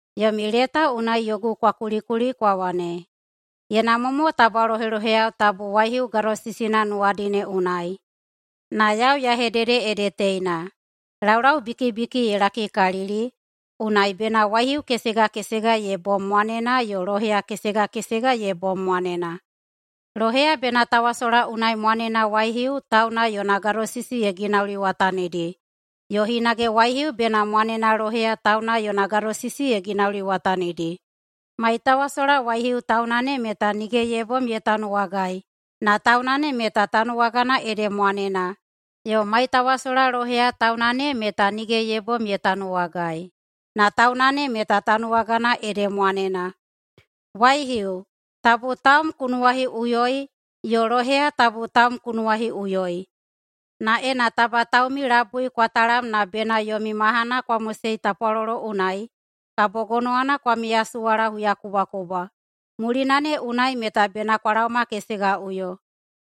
Yomi leta unai yogu kwa kulikuli kwa wane, “Ye namwa mo taba loheloheyao tabu waihiu gadosisina nuwadi ne unai.” Na yau ya hedede ede teina: Laulaubikibiki ye lakikalili, unai bena waihiu kesega kesega ye bom mwanena yo loheya kesega kesega ye bom mwanena. Loheya bena tawasola unai mwanena waihiu tauna yona gadosisi ye ginauliwatanidi, yo hinage waihiu bena mwanena loheya tauna yona gadosisi ye ginauliwatanidi. Maitawasola waihiu tauna ne meta nige ye bom ye tanuwagai na tauna ne meta tanuwagana ede mwanena, yo maitawasola loheya tauna ne meta nige ye bom ye tanuwagai, na tauna ne meta tanuwagana ede mwanena. Waihiu, tabu taum ku nuwahiꞌuyoi, yo loheya, tabu taum ku nuwahiꞌuyoi. Na ena taba taumi labui kwa talam na bena yomi mahana kwa mosei tapwalolo unai, kabo gonowana kwa miyasuwala huyakubwakubwa. Mulina ne unai meta bena kwa laomakesegaꞌuyo.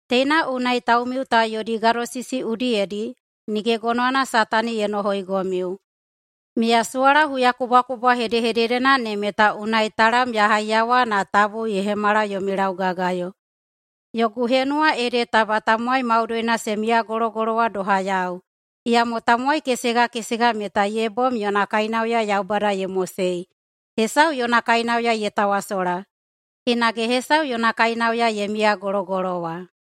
Teina unai taumiu ta yodi gadosisi udiyedi nige gonowana Satani ye nohoigomiu. Miyasuwala huyakubwakubwa hedehededena ne meta unai talam ya haiyawa na tabu ye hemala yomi laugagayo. Yogu henuwa ede taba tamowai maudoina se miyagologolowa doha yau. Iyamo tamowai kesega kesega meta ye bom yona kainauya Yaubada ye mosei. Hesau yona kainauya ye tawasola, hinage hesau yona kainauya ye miyagologolowa.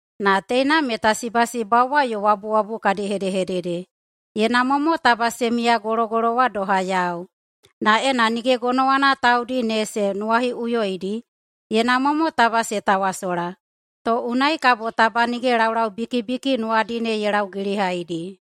Na teina meta sibasibauwa yo wabuwabu kadi hedehedede. Ye namwa mo taba se miyagologolowa doha yau. Na ena nige gonowana taudi ne se nuwahiꞌuyoidi, ye namwa mo taba se tawasola, to unai kabo taba nige laulaubikibiki nuwadi ne ye laugilihaidi.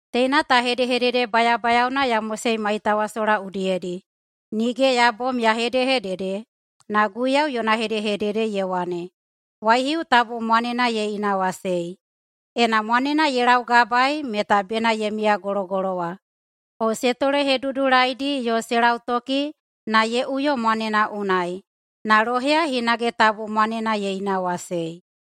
Teina ta hedehedede bayabayaona ya mosei maitawasola udiyedi, nige ya bom ya hedehedede, na Guiyau yona hedehedede, ye wane, waihiu tabu mwanena ye inawasei. Ena mwanena ye laugabaei meta bena ye miyagologolowa, o se tolehedudulaidi yo se lautoki na ye uyo mwanena unai. Na loheya hinage tabu mwanena ye inawasei.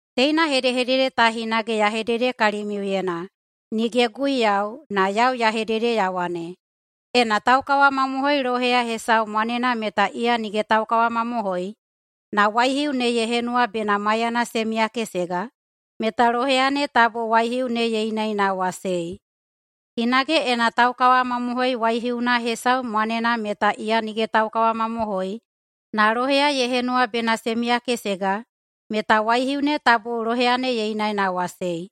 Teina hedehedede ta hinage ya hedede kalimiuyena, nige Guiyau, na yau ya hedede ya wane, Ena taukawamamohoi loheya hesau mwanena meta iya nige taukawamamohoi, na waihiu ne ye henuwa bena maiyana se miyakesega, meta loheya ne tabu waihiu ne ye inaꞌinawasei. Hinage ena taukawamamohoi waihiuna hesau mwanena meta iya nige taukawamamohoi, na loheya ye henuwa bena se miyakesega, meta waihiu ne tabu loheya ne ye inaꞌinawasei.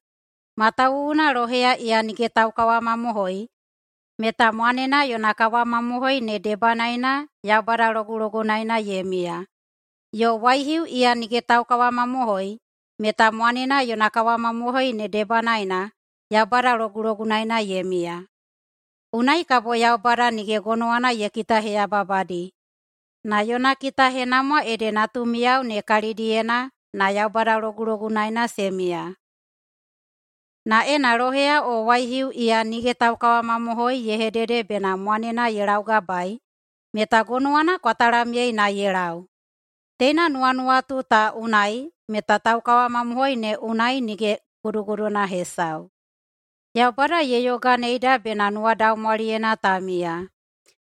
Matawuwuna loheya iya nige taukawamamohoi meta mwanena yona kawamamohoi ne debanaena Yaubada logulogunaena ye miya. Yo waihiu iya nige taukawamamohoi meta mwanena yona kawamamohoi ne debanaena Yaubada logulogunaena ye miya. Unai kabo Yaubada nige gonowana ye kitaheyababadi, na yona kitahenamwa ede natumiyao ne kalidiyena na Yaubada logulogunaena se miya. Na ena loheya o waihiu iya nige taukawamamohoi ye hedede bena mwanena ye laugabaei, meta gonowana kwa talamyei na ye lau. Teina nuwanuwatu ta unai meta taukawamamohoi ne unai nige guduguduna hesau. Yaubada ye yoganeida bena nuwadaumwaliyena ta miya.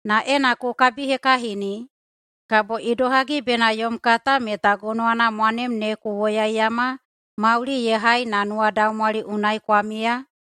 Na ena ku kabihekahini, kabo idohagi bena yom kata meta gonowana mwanem ne ku woyaiyama mauli ye hai na nuwadaumwali unai kwa miya?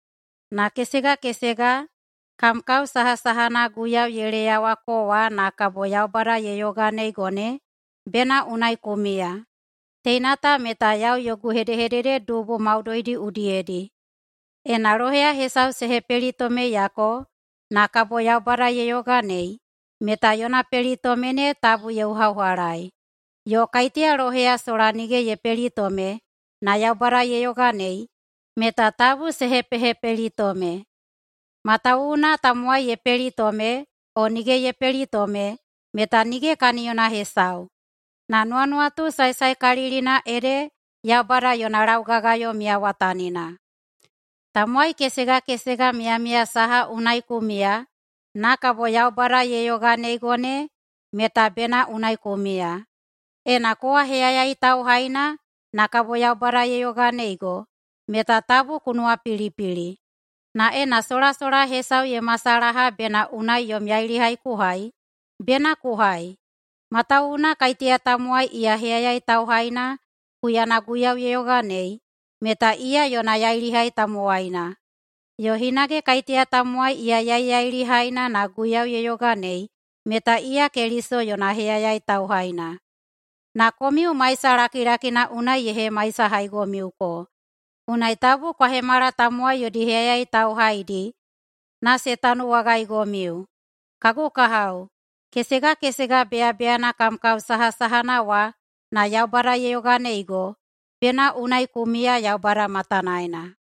Na kesega kesega, kam kao sahasahana Guiyau ye leyawako wa na kabo Yaubada ye yoganeigo ne, bena unai ku miya. Teina ta meta yau yogu hedehedede dubu maudoidi udiyedi. Ena loheya hesau se hepelitomeyako na kabo Yaubada ye yoganei, meta yona pelitome ne tabu ye uhaꞌuhalaei. Yo kaiteya loheya sola nige ye pelitome na Yaubada ye yoganei, meta tabu se hepehepelitome. Matawuwuna tamowai ye pelitome o nige ye pelitome meta nige kaniyona hesau. Na nuwanuwatu saesaekalilina ede Yaubada yona laugagayo miyawatanina. Tamowai kesega kesega miyamiya saha unai ku miya na kabo Yaubada ye yoganeigo ne meta bena unai ku miya. Ena kowa heyayai tauhaina na kabo Yaubada ye yoganeigo meta tabu ku nuwapilipili. Na ena solasola hesau ye masalaha bena unai yom yailihai ku hai, bena ku hai. Matawuwuna kaiteya tamowai iya heyayai tauhaina huyana Guiyau ye yoganei, meta iya yona yailihai tamowaina, yo hinage kaiteya tamowai iya yaiyailihaina na Guiyau ye yoganei meta iya Keliso yona heyayai tauhaina. Na komiu maisa lakilakina unai ye hemaisahaigomiuko, unai tabu kwa hemala tamowai yodi heyayai tauhaidi na se tanuwagaigomiu. Kagu kahao, kesega kesega beyabeyana kam kao sahasahana wa na Yaubada ye yoganeigo, bena unai ku miya Yaubada matanaena.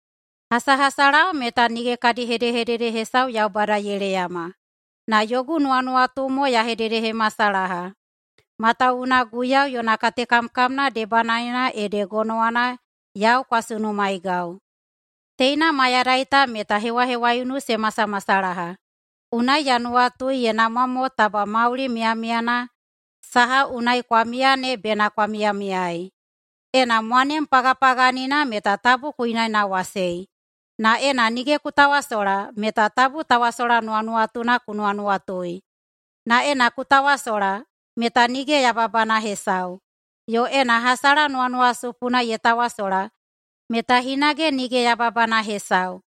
Hasahasalao meta nige kadi hedehedede hesau Yaubada ye leyama. Na yogu nuwanuwatu mo ya hededehemasalaha, matawuwuna Guiyau yona katekamkamna debanaena ede gonowana yau kwa sunumaegau. Teina mayadai ta meta hewahewaiunu se masamasalaha, unai ya nuwatui ye namwa mo taba mauli miyamiyana saha unai kwa miya ne bena kwa miyamiyaei. Ena mwanem pagapaganina meta tabu ku inaꞌinawasei, na ena nige ku tawasola meta tabu tawasola nuwanuwatuna ku nuwanuwatui. Na ena ku tawasola meta nige yababana hesau, yo ena hasala nuwanuwasupuna ye tawasola meta hinage nige yababana hesau.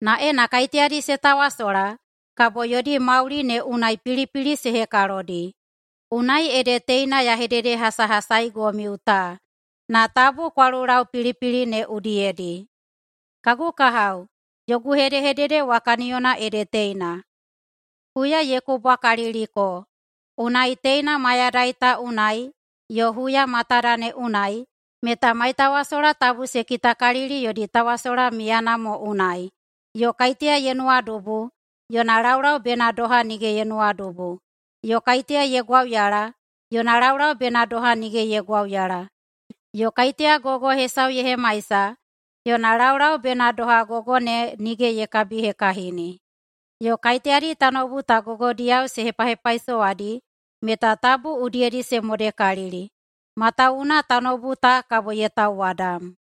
Na ena kaiteyadi se tawasola, kabo yodi mauli ne unai pilipili se hekalodi. Unai ede teina ya hededehasahasaigomiu ta, na tabu kwa lulau pilipili ne udiyedi. Kagu kahao, yogu hedehedede wa kaniyona ede teina: Huya ye kubwakaliliko. Unai, teina mayadai ta unai yo huya matada ne unai meta maitawasola tabu se kitakalili yodi tawasola miyana mo unai, yo kaiteya ye nuwadubu yona laulau bena doha nige ye nuwadubu, yo kaiteya ye gwauyala yona laulau bena doha nige ye gwauyala, yo kaiteya gogo hesau ye hemaisa yona laulau bena doha gogo ne nige ye kabihekahini. Yo kaiteyadi tanoubu ta gogodiyao se hepahepaisowadi meta tabu udiyedi se modekalili. Matawuwuna tanoubu ta kabo ye tauwadam.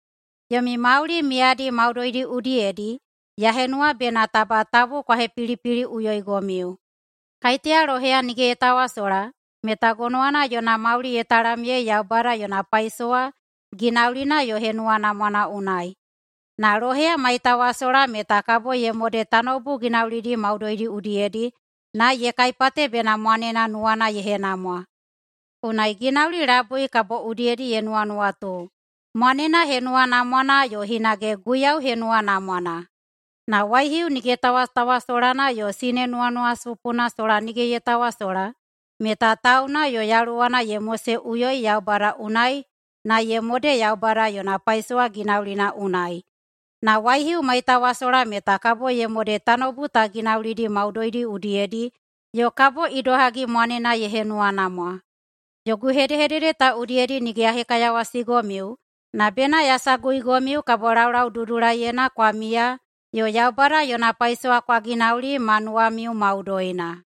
Yomi mauli miyadi maudoidi udiyedi ya henuwa bena taba tabu kwa hepilipiliꞌuyoigomiu. Kaiteya loheya nige ye tawasola meta gonowana yona mauli ye talamyei Yaubada yona paisowa ginaulina yo henuwanamwana unai. Na loheya maitawasola meta kabo ye mode tanoubu ginaulidi maudoidi udiyedi na ye kaipate bena mwanena nuwana ye henamwa. Unai ginauli labui kabo udiyedi ye nuwanuwatu: Mwanena henuwanamwana yo hinage Guiyau henuwanamwana. Na waihiu nige tawatawasolana yo sine nuwanuwasupuna sola nige ye tawasola meta tauna yo yaluwana ye moseꞌuyoi Yaubada unai na ye mode Yaubada yona paisowa ginaulina unai. Na waihiu maitawasola meta kabo ye mode tanoubu ta ginaulina maudoidi udiyedi yo kabo idohagi mwanena ye henuwanamwa. Yogu hedehedede ta udiyedi nige ya hekaiyawasigomiu na bena ya saguigomiu kabo laulaududulaiyena kwa miya yo Yaubada yona paisowa kwa ginauli ma nuwamiu maudoina.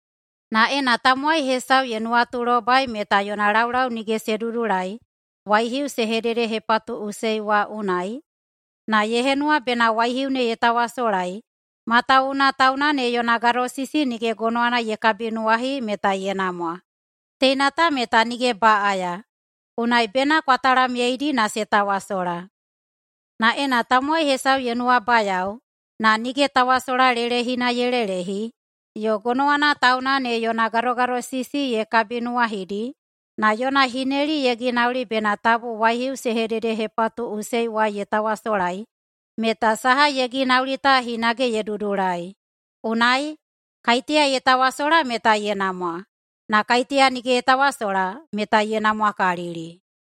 Na ena tamowai hesau ye nuwatulobai meta yona laulau nige se dudulai waihiu se hededehepatuꞌusei wa unai, na ye henuwa bena waihiu ne ye tawasolai matawuwuna tauna ne yona gadosisi nige gonowana ye kabinuwahi, meta ye namwa. Teina ta meta nige baꞌaya, unai bena kwa talamyeidi na se tawasola. Na ena tamowai hesau ye nuwabayao, na nige tawasola lelehina ye lelehi, yo gonowana tauna ne yona gadogadosisi ye kabinuwahidi, na yona hineli ye ginauli bena tabu waihiu se hededehepatuꞌusei wa ye tawasolai, meta saha ye ginauli ta hinage ye dudulai. Unai, kaiteya ye tawasola meta ye namwa, na kaiteya nige ye tawasola meta ye namwakalili.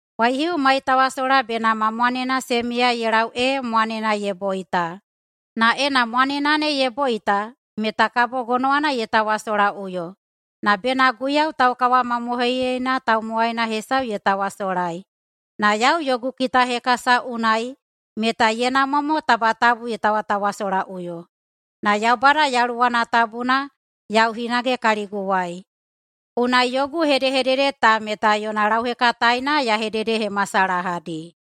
Waihiu maitawasola bena ma mwanena se miya ye lau ee mwanena ne ye boita. Na ena mwanena ne ye boita meta kabo gonowana ye tawasolaꞌuyo, na bena Guiyau taukawamamohoiyeina tamowaina hesau ye tawasolai. Na yau yogu kitahekasa unai meta ye namwa mo tabu ye tawatawasolaꞌuyo. Na Yaubada Yaluwana Tabuna yau hinage kaliguwai, unai yogu hedehedede ta meta yona lauhekataena ya hededehemasalahadi.